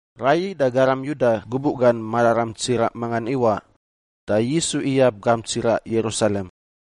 Raiyi da garam Yuda gubuꞌ gan mararam tsiraꞌ mangan iwaꞌ, da Yisu iyab gamp tsiraꞌ Yerusalem.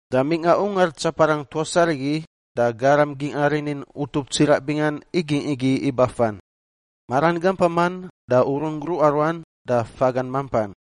Da mingꞌa ungar tsaparang tuas arigi da garam gingꞌa rinin utup tsiraꞌ bingan igingꞌ igi ibafan, maran gampaman da urun gruꞌa ruan da fagan mampan.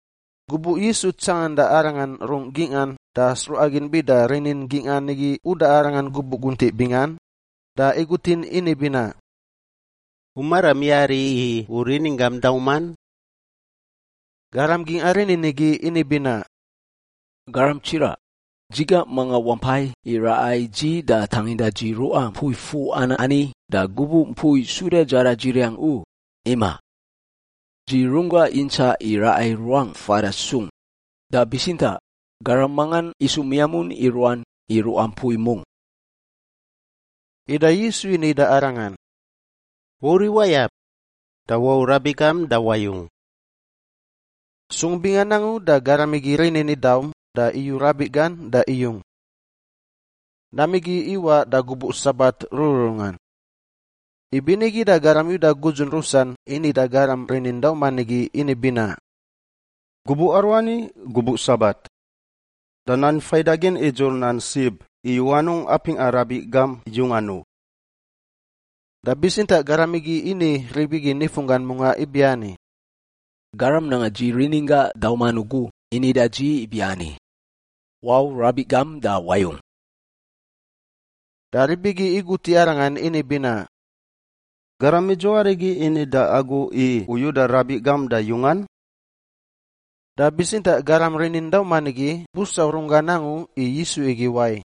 Gubuꞌ Yisu tsanganda arangan rungꞌ gingꞌan da sruꞌa gin bida rinin gingꞌan igi uda arangan gubuꞌ guntiꞌ bingan da igutin ini binaꞌ, “U maram yari i u rininggam dauman?” Garam gingꞌa rinin igi ini binaꞌ, “Garam tsiraꞌ, dzi gangꞌ mangan wampai i raꞌa i dzi da tanginda dzi ruꞌa mpui fuꞌan ani da gubuꞌ mpui suda dzaradziriang u, imaꞌ. Dzi runggangꞌ yintsaꞌ i raꞌa i ruangꞌ fada sung, da bitsintaꞌ garam mangan isu miamun i ruan i ruꞌa mpui mungꞌ.” Ida Yisu ini da arangan, “Wauriꞌ wayab! Da wau rabiꞌ gam da wayung!” Sung bingan angu da garam igi rinin idaum da iyu rabiꞌ gan da iyung. Nam igi iwaꞌ da gubuꞌ Sabat rururungan. Ibinigi da garam Yuda gudzun rusan ini da garam rinin dauman igi ini binaꞌ, “Gubuꞌ aruani gubuꞌ Sabat! Da Nan faidagin idzur nan sib i u anungꞌ apingꞌa rabiꞌ gam yungan u.” Da bitsintaꞌ garam igi ini rib igi nifunggan mungꞌa ibiani, “Garam nanga dzi rininggangꞌ dauman ugu ini da dzi ibiani, ‘Wau rabiꞌ gam da wayung!’” Da rib igi igut i arangan ini binaꞌ, “Garam idzuwai arigi ini da agu i u yuda rabiꞌ gam da yungan?” Da bitsintaꞌ garam rinin dauman igi busau runggan angu i Yisu igi wai,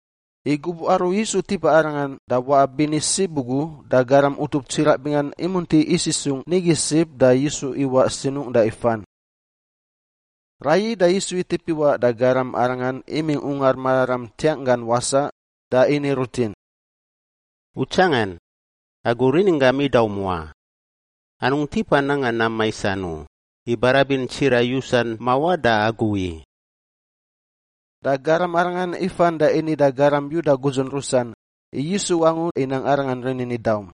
i gubuꞌ aru Yisu tipa arangan da waꞌa bini sib ugu da garam utup tsiraꞌ bingan imunti isisungꞌ nigi sib da Yisu iwaꞌ sinungꞌ da ifan. Raiyi da Yisu itip iwaꞌ da garam arangan imingꞌ Ungar Mararam ntiangꞌ gan wasaꞌ da ini rutin, “U tsangan! Agu rininggam idaum wa. Anungꞌ tipa nanga nam maisan u, i barabin tsiraꞌ yusan mawaꞌ da agu i.” Da garam arangan ifan da ini da garam Yuda gudzun rusan i Yisu angu inang da arangan rininggan idaum.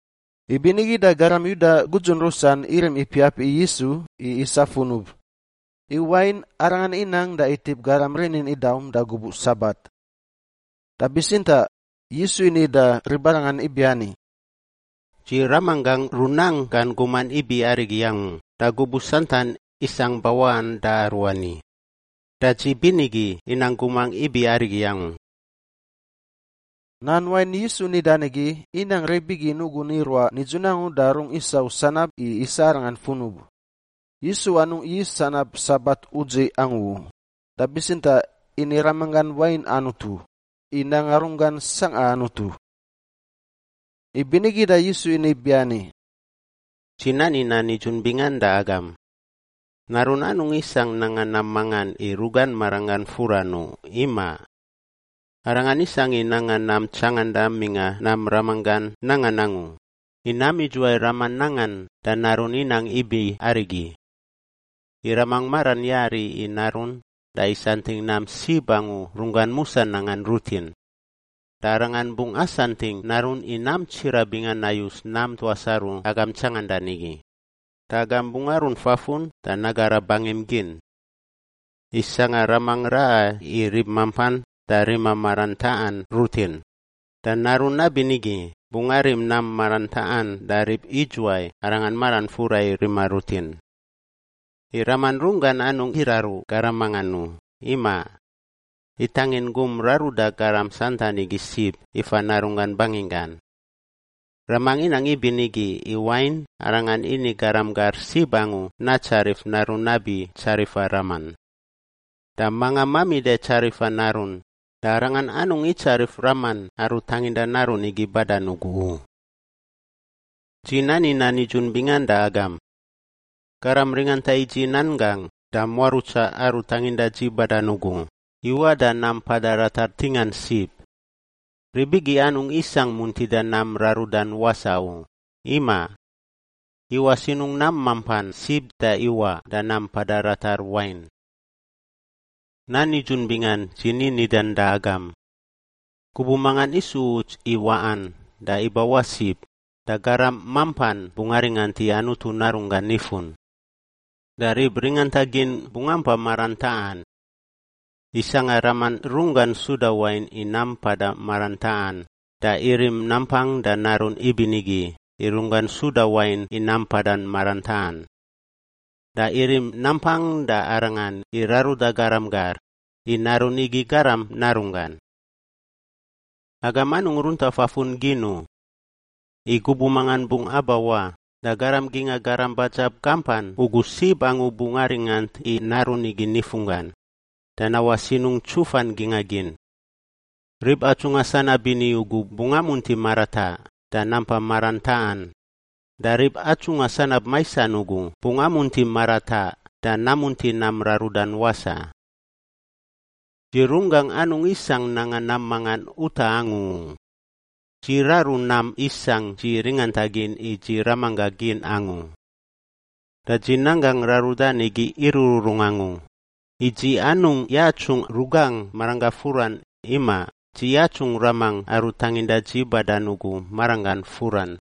Ibinigi da garam Yuda gudzun rusan irim ipiap i Yisu i isa funub, i wain Arangan inang da itip garam rinin idaum da gubuꞌ Sabat. Da bitsintaꞌ Yisu ini da ribarangan ibiani, “Dzi Ramanggangꞌ runang gan guman ibi arigi angu da gubuꞌ santan isangꞌ bawaꞌan da aruani, da dzi binigi inang gumangꞌ ibi arigi angu.” Nan wain Yisu nidan igi inang rib igi nugun iruaꞌ nidzun da rungꞌ isau sanab i isa Arangan funub. Yisu anungꞌ yis sanab Sabat udziꞌ angu u, da bitsintaꞌ ini Ramanggan wain Anutu, i nanga runggan sangꞌa Anutu. Ibinigi da Yisu ini ibiani, “Dzi nani nan nidzun bingan da agam! Narun anungꞌ isangꞌ nanga nam mangan i rugan maranggan furan u, imaꞌ. Arangan isangꞌ i nanga nam tsanganda mingꞌa nam Ramanggan nangan angu, i nam idzuwai Raman nangan, da Narun inang ibi arigi. I Raman maran yari i Narun da isantingꞌ nam sib angu runggan musa nangan rutin. Da Arangan bungꞌ asantingꞌ Narun i nam tsiraꞌ bingan nayus nam tuas aru agam tsangandan igi, da agam bungꞌ arunt fafun da nagara bangim gin. I sangꞌa Raman raꞌa i rib mampan da rima nam maran taꞌan rutin, da Narun nabinigi bungꞌ arim nam maran taꞌan da rib idzuwai arangan maran fura i rima rutin. I Raman runggan anungꞌ iraru garam mangan u, imaꞌ. Itangin gum raruda garam santan igi sib ifa Narunggan banginggan. Raman inang ibinigi i wain Arangan ini garam gar sib angu natsarif Narun nabi tsarifa Raman. Da manga mamida i tsarifa Narun, da arangan anungꞌ itsarif Raman aru tanginda Narun igi badan ugu u. “Dzi nani nan nidzun bingan da agam! Garam ringanta i dzi nan gangꞌ da muarutsa Aru tanginda dzi badan ugu iwaꞌ da nam mpada ratar ntingan sib. Rib igi anungꞌ isangꞌ muntida nam rarudan wasaꞌ u, imaꞌ. Iwaꞌ sinungꞌ nam mampan sib da iwaꞌ da nam mpada ratar wain. “Nan nidzun bingan dzi ni nidan da agam! Gubuꞌ mangan isu uts i waꞌan da ibawaꞌ sib, da garam mampan bungꞌ aringant i Anutu Narunggan nifun. Da rib ringanta gin bungꞌ ampa maran taꞌan. I sangꞌa Raman runggan suda wain i nam mpada maran taꞌan, da irim nampang da Narun ibinigi i runggan suda wain i nam mpada maran taꞌan. Da irim nampang da Arangan i raruda garam gar, i Narun igi Garam Narunggan. “Agam anungꞌ runta fafun gin u! I gubuꞌ mangan bungꞌ abawaꞌ da garam gingꞌa garam badzab gampan ugu sib angu bungꞌ aringant i Narun igi nifunggan, da nawaꞌ sinungꞌ ntsufan gingꞌa gin. Rib atsungꞌa sanab bini ugu bungꞌ amunti marataꞌ da nampa maran taꞌan, da rib atsungꞌa sanab maisan ugu bungꞌ amunti marataꞌ da namunti nam rarudan wasaꞌ. “Dzi runggangꞌ anungꞌ isangꞌ nanga nam mangan utaꞌ angu u; dzi raru nam isangꞌ dzi ringantagin i dzi Ramanggangꞌ gin angu. Da dzi nanggangꞌ rarudan igi irururung angu, i dzi anungꞌ yatsungꞌ rugangꞌ maranggangꞌ furan; imaꞌ, dzi yatsungꞌ Ramangꞌ aru tanginda dzi badan ugu maranggan furan.”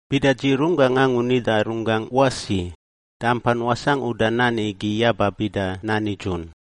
“Bida dzi runggangꞌ angu nida runggangꞌ wasi, da ampan wasangꞌ uda nan igi yaba bida nan nidzun.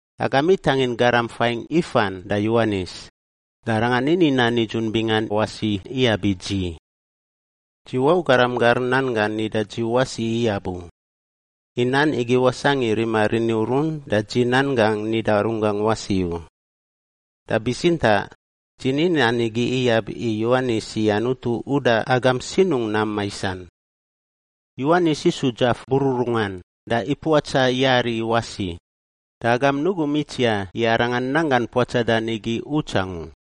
“Agam itangin garam faingꞌ ifan da Yowanis, da arangan ini nan nidzun bingan wasi iyab i dzi. Dzi wau garam gar nan gan nida dzi wasi iyab u, i nan igi wasangꞌ i rima rini urun da dzi nan gangꞌ nida runggangꞌ wasi u. Da bitsintaꞌ dzi ni nan igi iyab i Yowanis i Anutu uda agam sinungꞌ nam maisan. Yowanis isu dzaf bururungan da ipuatsa yari wasi, da agam nugum itsiaꞌ i arangan nanggan puatsadan igi uts angu.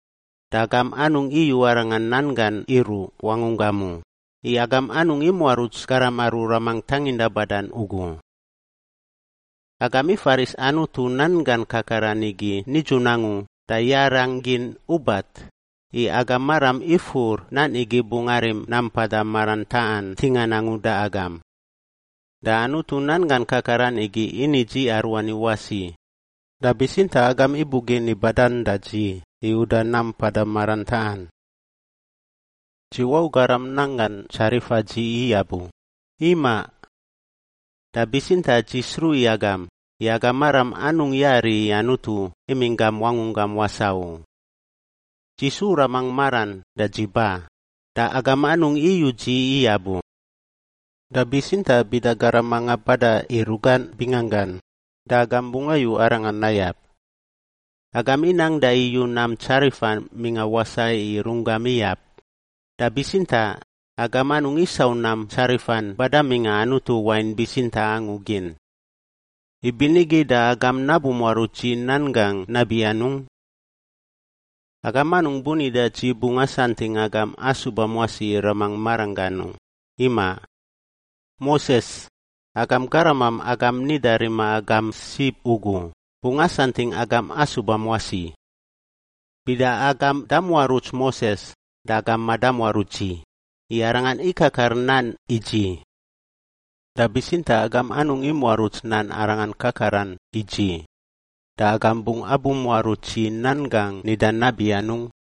Da agam anungꞌ iyu Arangan nan gan iruꞌ wangunggam u, i agam anungꞌ imuaruts garam aru Ramangꞌ tanginda badan ugu. “Agam ifaris Anutu nan gan kakaran igi nidzun angu da yarangꞌ gin ubat, i agam maram ifur nan igi bungꞌ arim nam mpada maran taꞌan ntingan angu da agam. Da Anutu nan gan kakaran igi ini dzi aruani wasi, da bitsintaꞌ agam ibugin i badan da dzi i uda nam mpada maran taꞌan. “Dzi wau garam nan gan tsarifa dzi iyab u, imaꞌ. Da bitsintaꞌ dzi sruꞌ i agam, i agam maram anungꞌ yari i Anutu imingꞌ gam wangunggam wasaꞌ u. Dzi su Ramangꞌ maran da dzi ba, da agam anungꞌ iyu dzi iyab u. Da bitsintaꞌ bida garam manga bada i rugan binganggan, da agam bungꞌ ayu arangan nayab. Agam inang da iyu nam tsarifan mingꞌa wasaꞌ i runggam iyab, da bitsintaꞌ agam anungꞌ isau nam tsarifan bada mingꞌa Anutu wain bitsintaꞌ angu gin. Ibinigi da agam nabumuaruts dzi nan gangꞌ nabi anungꞌ? “Agam anungꞌ bunida dzi bungꞌ asantingꞌ agam asubam wasi i Ramangꞌ maranggan u, imaꞌ. Moses, agam garamam agam nida rima agam sib ugu, bungꞌ asantingꞌ agam asubam wasi. Bida agam damuaruts Moses da agam madamuaruts dzi, i arangan ikakar nan i dzi. Da bitsintaꞌ agam anungꞌ imuaruts nan arangan kakaran i dzi, da agam bungꞌ abumuaruts dzi nan gangꞌ nidan nabi anungꞌ?”